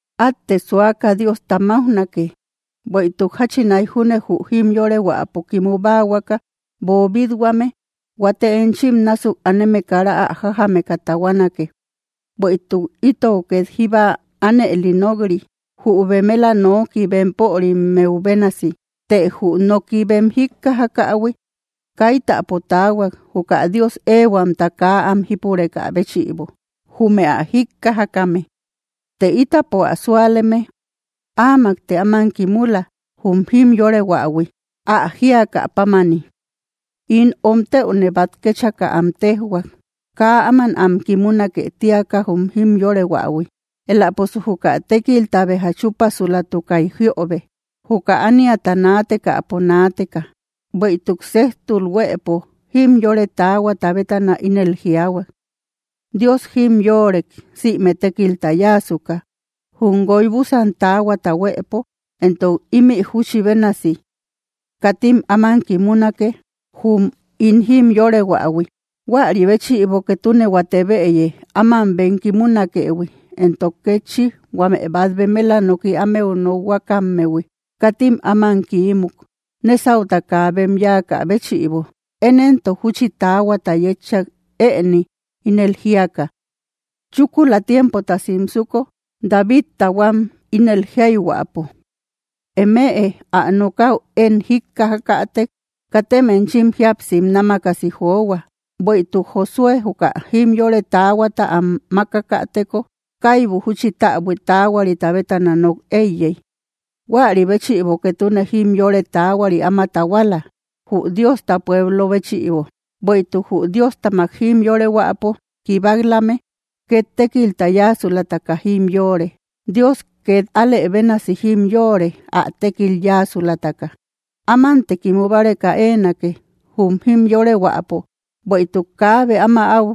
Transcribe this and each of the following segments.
¡Átte suaka Diosta máujnake! Bueïtuk jachinai junne jü jimyorehuäpo kimu báahuaka boobit-huame, huate enchim násuk aneme kara ä jájameka tahuanake. Bueïtuk itou két jíba ánëli nok‑ri, jü bemela noki bempörimmeu bénasi. Të jü noki bem jíkkajakähui, kaitapo taahuak, juka Dios éehuamta kaa am jípurekä béchïbo, jume ä jíkkajakame. Të ítapo ä súaleme áamakte áman kimula, jum jimyorehuähui, ä jíakä pámani: In omtëune bát kéchaka am téjhuak, kaa áman am kimunake tíaka jum jimyorehuähui. Éläposu juka tékilta béja chúpasulatukay jiöbe, juka ániata naatekäpo naateka. Bueïtuk séjtul huëpo jimyore taahuata bétana ínel jiaahuak: Dios jimyorek sïme tékilta yáasuka, jum guoy búsan taahuata huëpo. Entok ímï júchi bénasi: Katim áman kimunake, jum ín jimyorehuähui. Huäri béchïbo, ketune huate bëye áman bem kimunakëhui, entok kétchi huame bát bemela noki ámeu nokhuakammehui, katim áman kiímuk, nésauta kaa bem yáakä béchïbo. Én éntok júchi taahuata yétchak ëni, ínel jíaka: Chúkula tiempota simsuko, Davidta huam, ínel jíayhuäpo: Eme ä nokäu én jíkkajakätek, katem enchim jíapsim námakasi johua. Bueïtuk Josué juka jimyore taahuata am mákakäteko, kaibu júchi täbui taahuarita bétana nok éiyey. Huäri béchïbo ketune jimyore taahuari áma tahuala, jü Diosta pueblo béchïbo. Bueïtuk jü Diostamak jimyorehuäpo kibak‑lame, két tékilta yáasulataka jimyore. Dios két alë bénasi jimyore, ä tékil yáasulataka. Ámante kimu báreka éenake, jum jimyorehuäpo; bueïtuk kaabe áma áu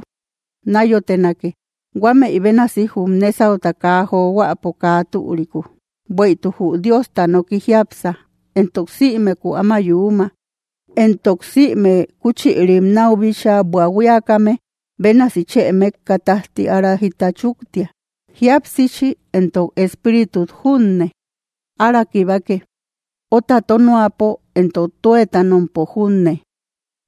náyotenake, huámëi bénasi, jum nésauta kaa johuäpo, kaa türiku. Bueïtuk jü Diosta noki jiápsa, entok sïmeku áma yuuma, entok sïme kúchïrim náu bíchaa buahuiakame bénasi chë mékka tájti ára jita chúktia. Jíapsichi entok espíritut junne ára kibake, óta tónoapo entok tuétanompo junne;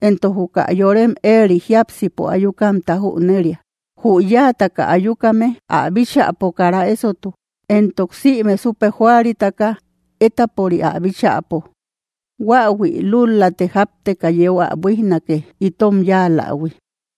entok juka yorem éeri jiápsipo ayukamta jüneria. Jü yáataka ayukame ä bíchäpo kara ésotu, entok sïme súpe joaritaka étapori ä bíchäpo. Huáahui lúl‑late jápteka yeu ä buíjnake, itom yáalähui.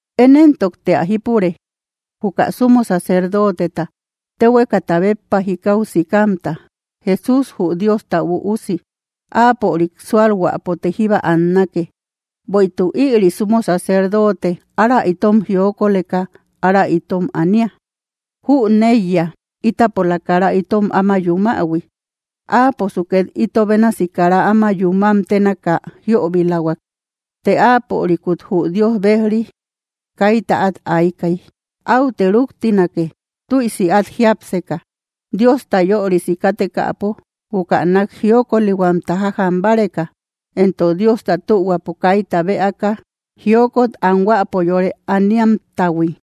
Én éntokte ä jípure, juka sumo sacerdoteta, téhuekata béppa jikau sikamta, Jesús jü Diosta Üusi. Áapörik súalhuäpote jíba annake. Bueïtuk ïri sumo sacerdote ára itom jiokoleka ára itom ania. Jüneiya ítapola kara itom áma yumähui. Áaposu két ito bénasi kara áma yúmam ténaka jiöbilahuak, të áapörikut jü Dios bejri kaita át aykay. Áute rúktinake, tüisi át jiápseka, Diosta yörisi kátekäpo, juka nák jiokolihuamta jajam báreka, entok Diosta tühuapo kaita bëaka jiokot anhuäpo yore aniamtahui.